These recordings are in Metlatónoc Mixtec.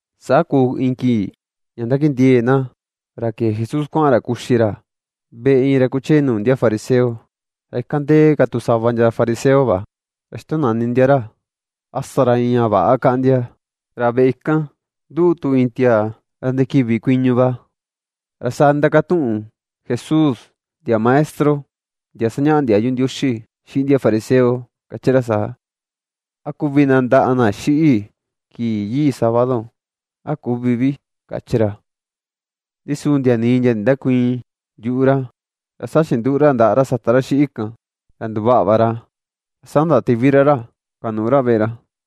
Saa kuu iin kii ña ndakindiee̱ na ra ke̱e Jesús kuaꞌan ra kuxi ra veꞌe iin ra kuchee nuu ndia fariseo. Ra ikan ndee ka tu sava ndia fariseo va. Ra xitonani ndia ra a sa ra iin ña väꞌa kaꞌan ndia. Ra veꞌe kan nduꞌu tu iin tiaa ra ndikiꞌvi kuiñu va. Ra saa ndindakatuꞌun Jesús ndia maestro, ndia sañaꞌa ndiayu Ndioxi xiꞌin ndia fariseo kachi ra saa: ―¿A kuvi nandaꞌa na xiꞌi kii yii sábado, a küvi vi? ―kachi ra. Ndi su ndia nii ndia ndindäkuiin yuꞌu ra. Ra saa chinduꞌu ra ndaꞌa ra sata ra xiꞌi kan ra nduvaꞌa va ra. Ra saa ndatiꞌvi ra ra kuanuꞌu ra veꞌe ra.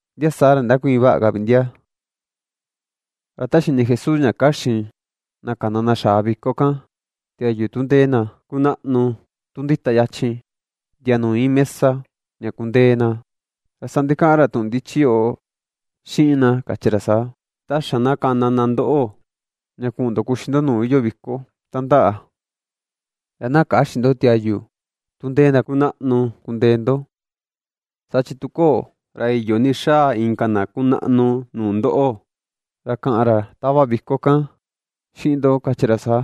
Ndia saa ra nindäkuiin vaꞌa ka vi ndia. Ra ta xini Jesús ña kaxin na kana na xaa viko kan tiayu tu ndee na kunaꞌnu, tu ndita yachin ndia nuu iin mesa ña kundee na, ra saa ndikaꞌan ra tuꞌun ndichi yoꞌo xiꞌin na kachi ra saa: ―Ta xa na kana na ndoꞌo ña kuꞌun ndo kuxi ndo nuu iyoo viko tandaꞌa, ra na käxin ndo tiayu tu ndee na kunaꞌnu kundee ndo. Saa chi tu köo, ra iyo ni xaa inka na kunaꞌnu nuu ndoꞌo, ra kaꞌan ra tava viko kan xiꞌin ndo kachi ra saa: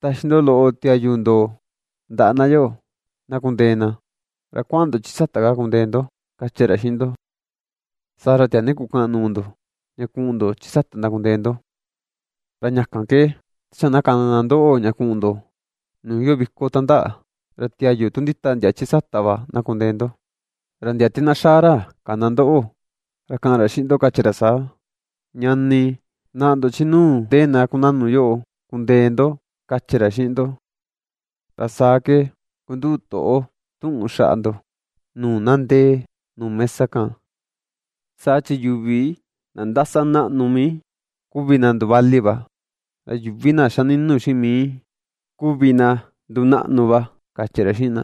“Taxi ndo loꞌo ndo tiayu ndo ndaꞌa na yoꞌo, na kundee na; ra kuaꞌan ndo chi sata kaa kundee ndo”, kachi ra xiꞌin ndo. Saa ra tiaa ni kukaꞌan nuu ndo, ña kuꞌun ndo chi sata ndakundee ndo. Ra ña kan ke ta xa na kana na ndoꞌo ña kuꞌun ndo nuu iyoo viko tandaꞌa, ra tiayu tu ndita ndia chi sata va na kundee ndo; ra ndia te na xaa ra kana ndoꞌo, ra kaꞌan ra xiꞌin ndo kachi ra saa: “Ñani, naꞌa ndo, chi nuu ndee na kunaꞌnu yoꞌo kundee ndo”, kachi ra xiꞌin ndo. Ra saa ke kunduꞌu toꞌo tuꞌun xaꞌa ndo nuu na ndee nuu mesa kan. Saa chi yuvi na ndasa naꞌnu mii, kuvi na nduvali va; ra yuvi na xa ninu xiꞌin mii, kuvi na ndunaꞌnu va ―kachi ra xiꞌin na.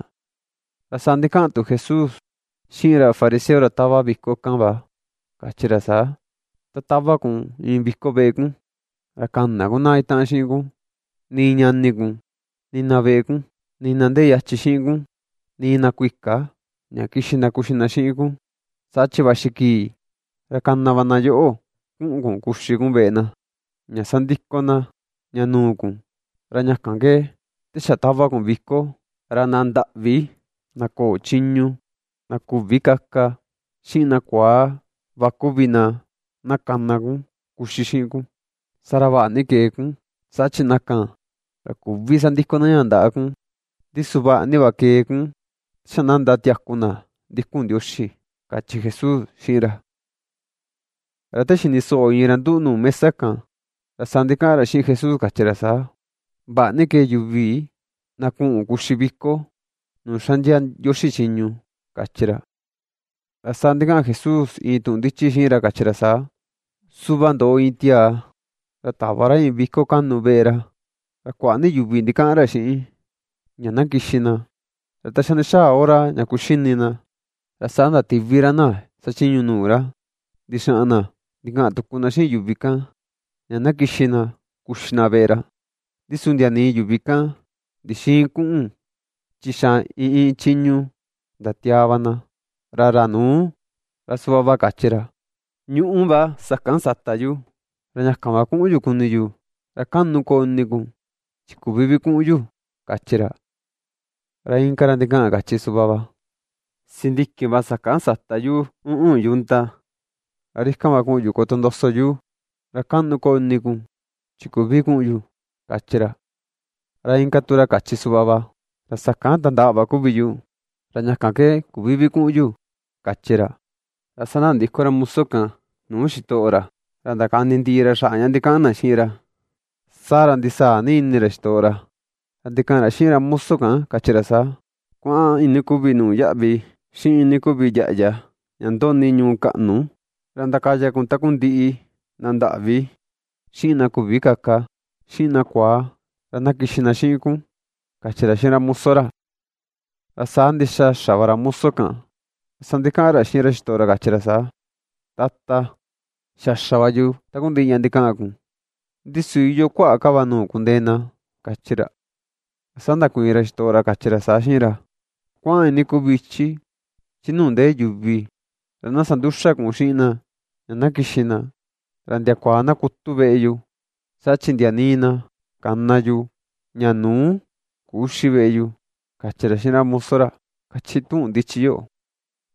Ra saa ndikaꞌan tu Jesús xiꞌin ra fariseo ra tava viko kan va kachi ra saa: ―Ta tava kun iin viko veꞌe kun, ra käna kun na itaꞌan xiꞌin kun, nii ñani kun, nii na veꞌe kun, nii na ndee yachin xiꞌin kun, nii na kuika ña kixi na kuxi na xiꞌin kun, saa chi vaxi kii ra kana va na yoꞌo kuꞌun kun kuxi kun veꞌe na. Ña sandiko na ña nuu kun. Ra ña kan ke te xa tava kun viko, ra na ndaꞌvi, na köo chiñu, na küvi kaka xiꞌin na kuaa va kuvi na, na kana kun na kuxi xiꞌin kun. Saa ra vaꞌa ni kee kun. Saa chi na kan, ra küvi sandiko na ña ndaꞌa kun, ndi su vaꞌa ni va kee kun ta xa na ndatiaku na ndikun Ndioxi ―kachi Jesús xiꞌin ra. Ra te xini soꞌo iin ra nduꞌu nuu mesa kan, ra saa ndikaꞌan ra xiꞌin Jesús kachi ra saa: ―Vaꞌa ni kee yuvi na kuꞌun kuxi viko nuu xaꞌndia Ndioxi chiñu ―kachi ra. Ra saa ndikaꞌan Jesús iin tuꞌun ndichi xiꞌin ra kachi ra saa: ―Suꞌva ndoꞌo iin tiaa, ra tava ra iin viko kaꞌnu veꞌe ra, ra kuaꞌa ni yuvi ndikaꞌan xiꞌin ña na kixi na. Ra ta xa ndixaa hora ña kuxini na, ra saa ndatiꞌvi ra na xachiñu nuu ra ndixaꞌan na ndikaꞌan tuku na xiꞌin yuvi kan, ña na kixi na kuxi na veꞌe ra. Ndi su ndia nii yuvi kan ndixïin kuꞌun chi xa iin iin chiñu ndatiaa va na: Ra ra nuu ra suꞌva va kachi ra: “Ñuꞌú va sakan sata yu, ra ña kan va kuꞌun yu kuni yu; ra kaꞌnu koo ini kun chi küvi vi kuꞌun yu”, kachi ra. Ra inka ra ndikaꞌan kachi suꞌva va: “Sindiki va sakan sata yu uꞌun yunta, ra ri kan va kuꞌun yu kotondoso yu; ra kaꞌnu koo ini kun chi küvi kuꞌun yu”, kachi ra. Ra inka tu ra kachi suꞌva va: “Ra sakan tandaꞌa va kuvi yu, ra ña kan ke küvi vi kuꞌun yu”, kachi ra. Ra saa ndandiko ra muso kan nuu xitoꞌo ra, ra ndakani ndiꞌi ra ña ndikaꞌan na xiꞌin ra. Saa ra ndisaa ni ini ra xitoꞌo ra, ra ndikaꞌan ra xiꞌin ra moso kan kachi ra saa: “Kuaꞌan iinii kuvi nuu yaꞌvi, xiꞌin iinii kuvi yaꞌya ña ndoꞌni ñuu kaꞌnu, ra ndakaya kun takundiꞌi na ndaꞌvi, xiꞌin na küvi kaka, xiꞌin na kuaa, ra na kixi na xiꞌin kun”, kachi ra xiꞌin ra muso ra. Ra saa ndixa xa va ra moso kan. Ra saa ndikaꞌan ra xiꞌin xitoꞌo ra kachi ra saa: “Tata, xa xa va yu takundiꞌi ña ndikaꞌan kun, ndi su iyoo kuaꞌa ka va nuu kundee na”, kachi ra. Ra saa ndakuiin ra xitoꞌo ra kachi ra saa xiꞌin ra: “Kuaꞌan iinii kuvi ichi chi nuu ndee yuvi, ra na sanduxa kun xiꞌin na ña na kixi na ra ndiakua na kutu veꞌe yu. Saa chi ndia nii na kana yu ña nuu, küxi veꞌe yu”, kachi ra xiꞌin ra muso ra, kachi tuꞌun ndichi yoꞌo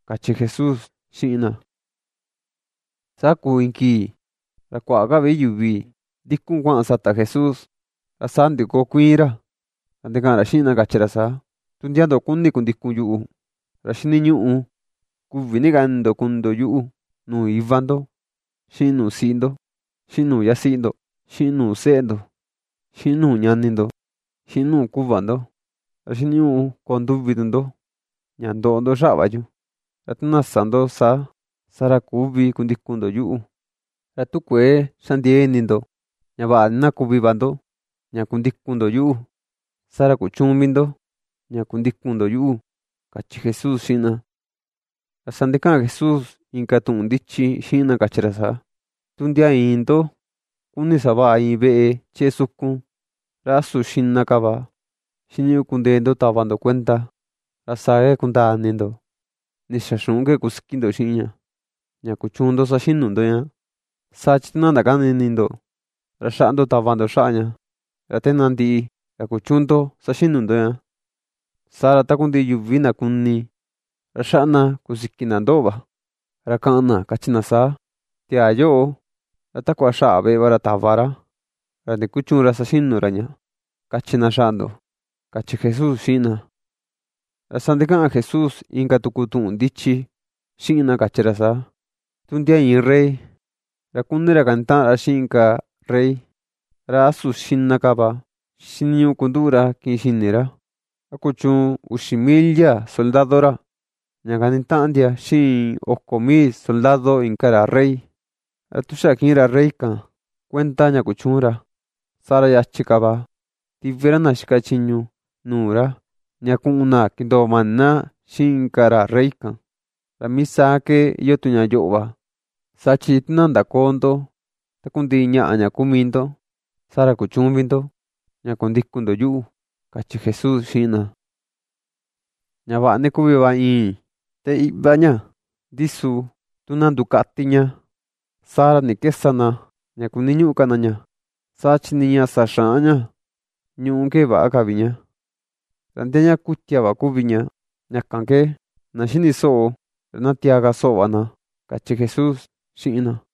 ―kachi Jesús xiꞌin na. Saa kuu iin kii ra kuaꞌa ka vi yuvi ndikun kuaꞌan sata Jesús, ra saa ndikokuiin ra, ra ndikaꞌan ra xiꞌin na kachi ra saa: ―Tu ndia ndo kuni kundikun yuꞌu, ra xiniñuꞌu kuꞌvi ni ka ini ndo kuni ndo yuꞌu, nuu iva ndo, xiꞌin nuu siꞌi ndo, xiꞌin nuu yasiꞌi ndo, xiꞌin nuu seꞌe ndo, xiꞌin nuu ñani ndo, xiꞌin nuu kuꞌva ndo. Ra xiniñuꞌu koo nduvi tu ndo ña ndoꞌo ndo xaꞌa va yu. Ra tu na sä ndo saa, saa ra küvi kundikun ndo yuꞌu. Ra tu kuëe xa ndiee ini ndo ña vaꞌa ni na kuvi va ndo ña kundikun ndo yuꞌu, saa ra kuchüun vi ndo ña kundikun ndo yuꞌu ―kachi Jesús xiꞌin na. Ra saa ndikaꞌan Jesús inka tuꞌun ndichi xiꞌin na kachi ra saa: ―Tu ndia iin ndo kuni savaꞌa iin veꞌe chee sukun, ¿ra a su xiꞌna ka va xiniñuꞌu kundee ndo tava ndo kuenda, ra saa ke kundaa ini ndo ndixaa xuꞌun ke kusiki ndo xiꞌin ña, ña kuchuun ndo saxinu ndo ña? Saa chi tu na ndakäni ini ndo, ra xaꞌa ndo tava ndo xaꞌa ña, ra te na ndiꞌi, ra kuchüun ndo saxinu ndo ña. Saa ra takundiꞌi yuvi na kuni, ra xaꞌa na kusiki na ndoꞌo va. Ra kaꞌan na kachi na saa: “Tiaa yoꞌo, ra takua xaꞌa va veꞌe ra tava ra, ra ndikuchüun ra saxinu ra ña”, kachi na xaꞌa ndo ―kachi Jesús xiꞌin na. Ra saa ndikaꞌan Jesús inka tuku tuꞌun ndichi xiꞌin na kachi ra saa: ―Tu ndia iin rey, ra kuni ra kanitaꞌan ra xiꞌin inka rey, ¿ra a su xiꞌna ka va xiniñuꞌu kunduꞌu ra kiꞌin xini ra, a kuchuun uxi mil ndia soldado ra, ña kanitaꞌan ndia xiꞌin oko mil soldado inka ra rey? Ra tu xa kiꞌin ra rey kan kuenda ña kuchüun ra, saa ra yachi ka va tiꞌvi ra na xika chiñu nuu ra ña kuꞌun na kindoo mani na xiꞌin inka ra rey kan. Ra mii saa ke iyoo tu ña yoꞌo va, saa chi tu na ndaköo ndo takundiꞌi ñaꞌa ña kuu mii ndo, saa ra kuchüun vi ndo ña kundikun ndo yuꞌu ―kachi Jesús xiꞌin na. ―Ña vaꞌa ni kuvi va i̱i̱n te iꞌva ña, ndi su tu na ndukati ña, saa ra, ¿ni ke sa na ña kuniñuꞌu ka na ña? Saa chi nii ña sa xaꞌan ña ñuꞌú ke väꞌa ka vi ña, ra ndia ña kutia va kuvi ña. Ña kan ke na xini soꞌo ra na tiaa ka soꞌo va na ―kachi Jesús xiꞌin na.